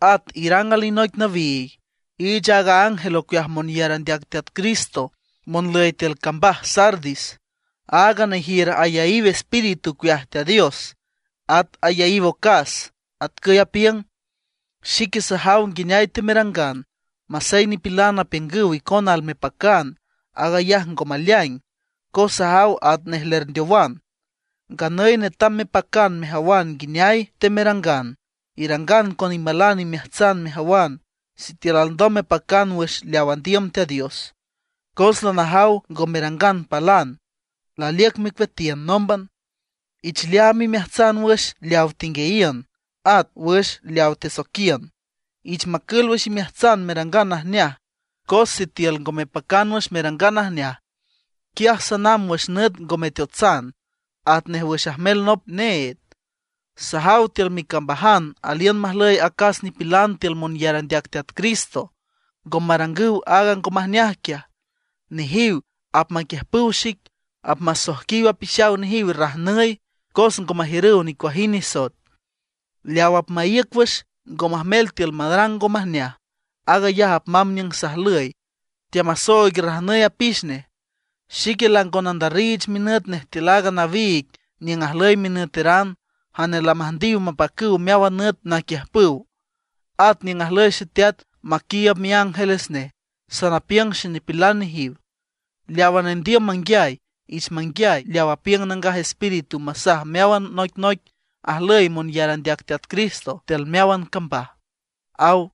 ’At irang alinoic nawiig, iich aaga ángel ocueaj monyar andeac Teat Cristo monlüy tiül cambaj Sardis: “Aaga nejiür ayaíw Espíritu ocueaj Teat Dios, at ayaíw ocas, atcüy apiüng: Xique sajaw nguineay temerangan, masey nipilan apiüngüw icona almepacan, aag ayaj ngo maleaing cos sajaw atnej lerndeowan. ¡Nganüy netam mepacan mejawan nguineay temerangan! Irangan con imalan imeajtsan mejawan sitiül alndom mepacan wüx leaw andiüm Teat Dios. Cos lanajaw ngo merangan palan, laliüc mecueatiün nómban. Ich leaam imeajtsan wüx leaw tenguiayiün, at wüx leaw tesoiquiün. Ich macül wüx imeajtsan merangan najneaj. Cos sitiül ngo mepacan wüx merangan najneaj, quiaj sanamb wüx nüt ngo meteotsan, atnej wüx ajmel nop need. Sajaw tiül micambajan aliün majlüy acas nipilan tiül monyar andeac Teat Cristo ngo marangüw aaga ngo majneaj quiaj. Nejiw apmaquiüjpüw xic, apmasoijquiw apixaw nejiw rajnüy cos ngo majiürüw nicuajind nisoet. Leaw apmaíüc wüx, ngo majmel tiül marang ngo majneaj, aag ayaj apmamb niüng sajlüy, teamasooig rajnüy apix nej. Xique lango nandarriich minüt nej tiül aaga nawiig niüng ajlüy minüteran jane lamüjndiw mapacüw meáwan nüt naquiüjpüw. At niüng ajlüy Xeteat maquiiüb miángeles nej, sanapiüng xenipilan nejiw. Leawa nendiüm manguiay, ich manguiay leaw apiüng Nangaj Espíritu masaj meáwan noicnoic ajlüy monyar andeac Teat Cristo tiül meáwan cambaj”, aw.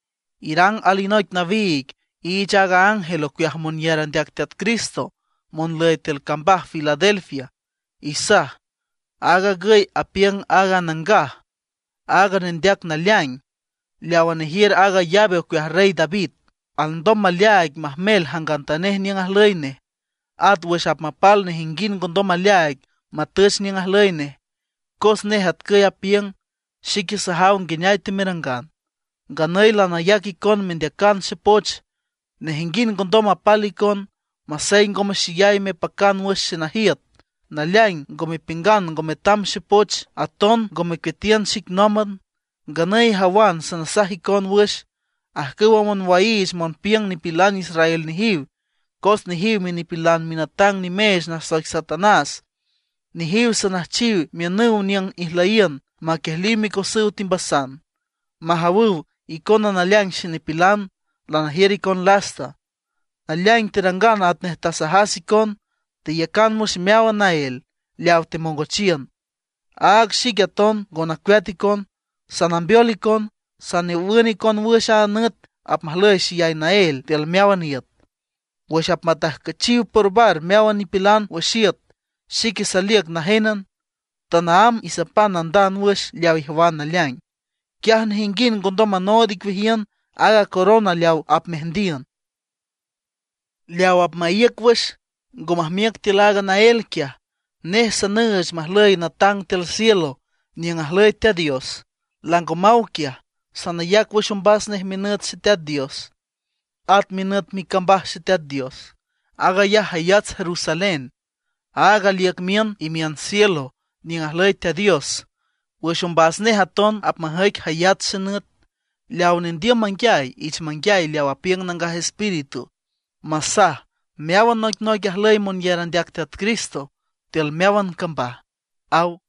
’Irang alinoic nawiig, iich aaga ángel ocueaj monyar andeac Teat Cristo monlüy tiül cambaj Filadelfia. Isaj: “Aag agüy apiüng aaga Nangaj, aaga Nendeac Naleaing, leawa nejiür aaga llave ocueaj Rey David, alndom maleaaig majmel jangantanej niüng ajlüy nej; at wüx apmapal nejinguind ngo ndom maleaaig matüch niüng ajlüy nej, cos nej atcüy apiüng: Xique sajaw nguineay temerangan. Nganüy lanayac icon mendeacan xepoch, nejinguind ngondom mapal icon. Masey ngome xeyay mepacan wüx xenajiüt, naleaing ngo mepiüngan ngo metam xepoch, aton ngo mecueatiün xic nómban. Nganüy ijawan sanasaj icon wüx ajcüwa monwaiich monpiüng nipilan israel nejiw. Cos nejiw minipilan minatang nimeech nasoic Satanás. Nejiw sanüjchiw miünüw niüng ijlüyiün maquiejliw micosüw timbasan, majawüw icona naleaing xenipilan, lanajiür icon lasta. Naleaing terangan atnej tasajas icon, teiücan wüx meáwan naél leaw temongochiün; áag xique aton ngo nacueat icon. Sanambeol icon, sanawün icon wüx a nüt apmajlüy xeyay naél tiül meáwan iüt, wüx apmatajcüchiw porbar meáwan nipilan wüx iüt. Xique saliüc najénan, tanaámb isapan nandand wüx leaw ijawan naleaing; quiaj nejinguind ngondom manood icueajiün aaga corona leaw apmeajndiün. Leaw apmaíüc wüx, ngo majmiüc tiül aaga naél quiaj, nej sanüüch majlüy natang tiül cielo niüng ajlüy Teat Dios; lango maw quiaj. Sanayac wüx ombas nej minüt Xeteat Dios, at minüt micambaj Xeteat Dios; aag ayaj jayats Jerusalén, áag aliüc miün imiün cielo niüng ajlüy Teat Dios. Wüx ombas nej aton apmajüic jayats xenüt. Leaw nendiüm manguiay, ich manguiay leaw apiüng Nangaj Espíritu masaj meáwan noicnoic ajlüy monyar andeac Teat Cristo tiül meáwan cambaj”, aw.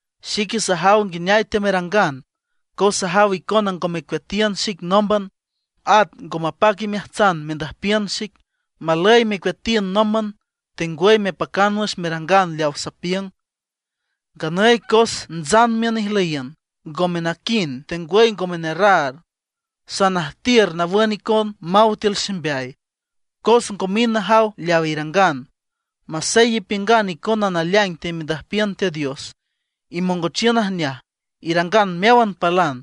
Xique sajaw nguineay teamerangan, cos sajaw icona ngo mecueatiün xic nómban, at ngo mapac imeajtsan mendüjpiün xic. ¡Malüy mecueatiün nómban tengwüy mepacan wüx merangan leawa sapiüng! Nganüy cos ntsan miün ijlüyiün, ngome naquind tengwüy ngome nerraar, sanajtiür nawün icon maw tiül ximbeay, cos ngo mind najaw leaw irangan. Masey ipiüngan icona naleaing temendüjpiün Teat Dios, imongochiün najneaj, irangan meáwan palan,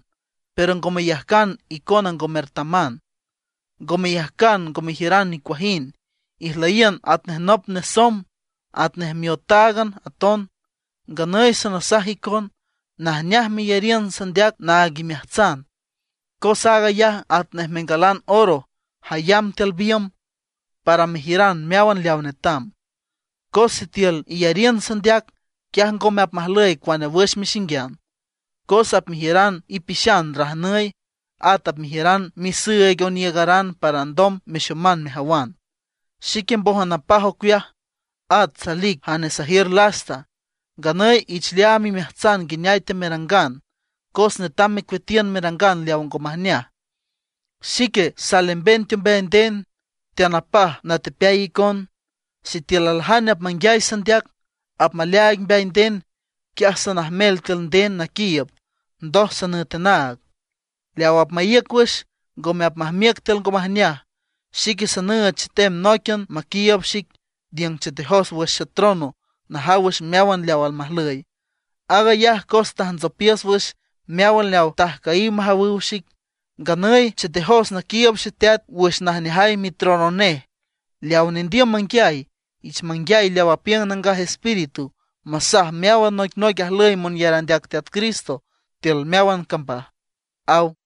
pero ngo meyajcan icona ngo mertaman, ngo meyajcan ngo mejiüran nicuajind, ijlüyiün atnej nop nesomb, atnej miotáagan aton. Nganüy sanasaj icon, najneaj meyariün sandeac naag imeajtsan; cos aag ayaj atnej mengalan oro jayam tiül biümb, para mejiüran meáwan leaw netam. Cos sitiül iyariün sandeac, quiaj ngome apmajlüy cuane wüx mexinguian, cos apmejiüran ipixan rajnüy. At apmejiüran misüüig oniiügaran para alndom mexoman mejawan. Xique mbójan napaj ocueaj, at salic jane sajiür lasta. Nganüy ich leaam imeajtsan nguineay teamerangan, cos netam mecueatiün merangan leaw ngo majneaj. Xique salemben teombeay nden, teanapaj natepeay icon. Sitiül aljane apmanguiay sandeac, apmaleaaig mbeay nden, quiaj sanajmel tiül nden naquiiüb, ndoj sanüet anaag. Leawa apmaíüc wüx, ngome apmajmiüc tiül ngo majneaj, xique sanüüch chetem nóiquian maquiiüb xic niüng chetejos wüx xetrono najaw wüx meáwan leaw almajlüy. Aag ayaj cos tajntsopiüs wüx meáwan leaw tajcüyiw majawüw xic. Nganüy chetejos naquiiüb Xeteat wüx najneajay mitrono nej. Leaw nendiüm manguiay, ich manguiay leaw apiüng Nangaj Espíritu masaj meáwan noicnoic ajlüy monyar andeac Teat Cristo tiül meáwan cambaj” ―aw.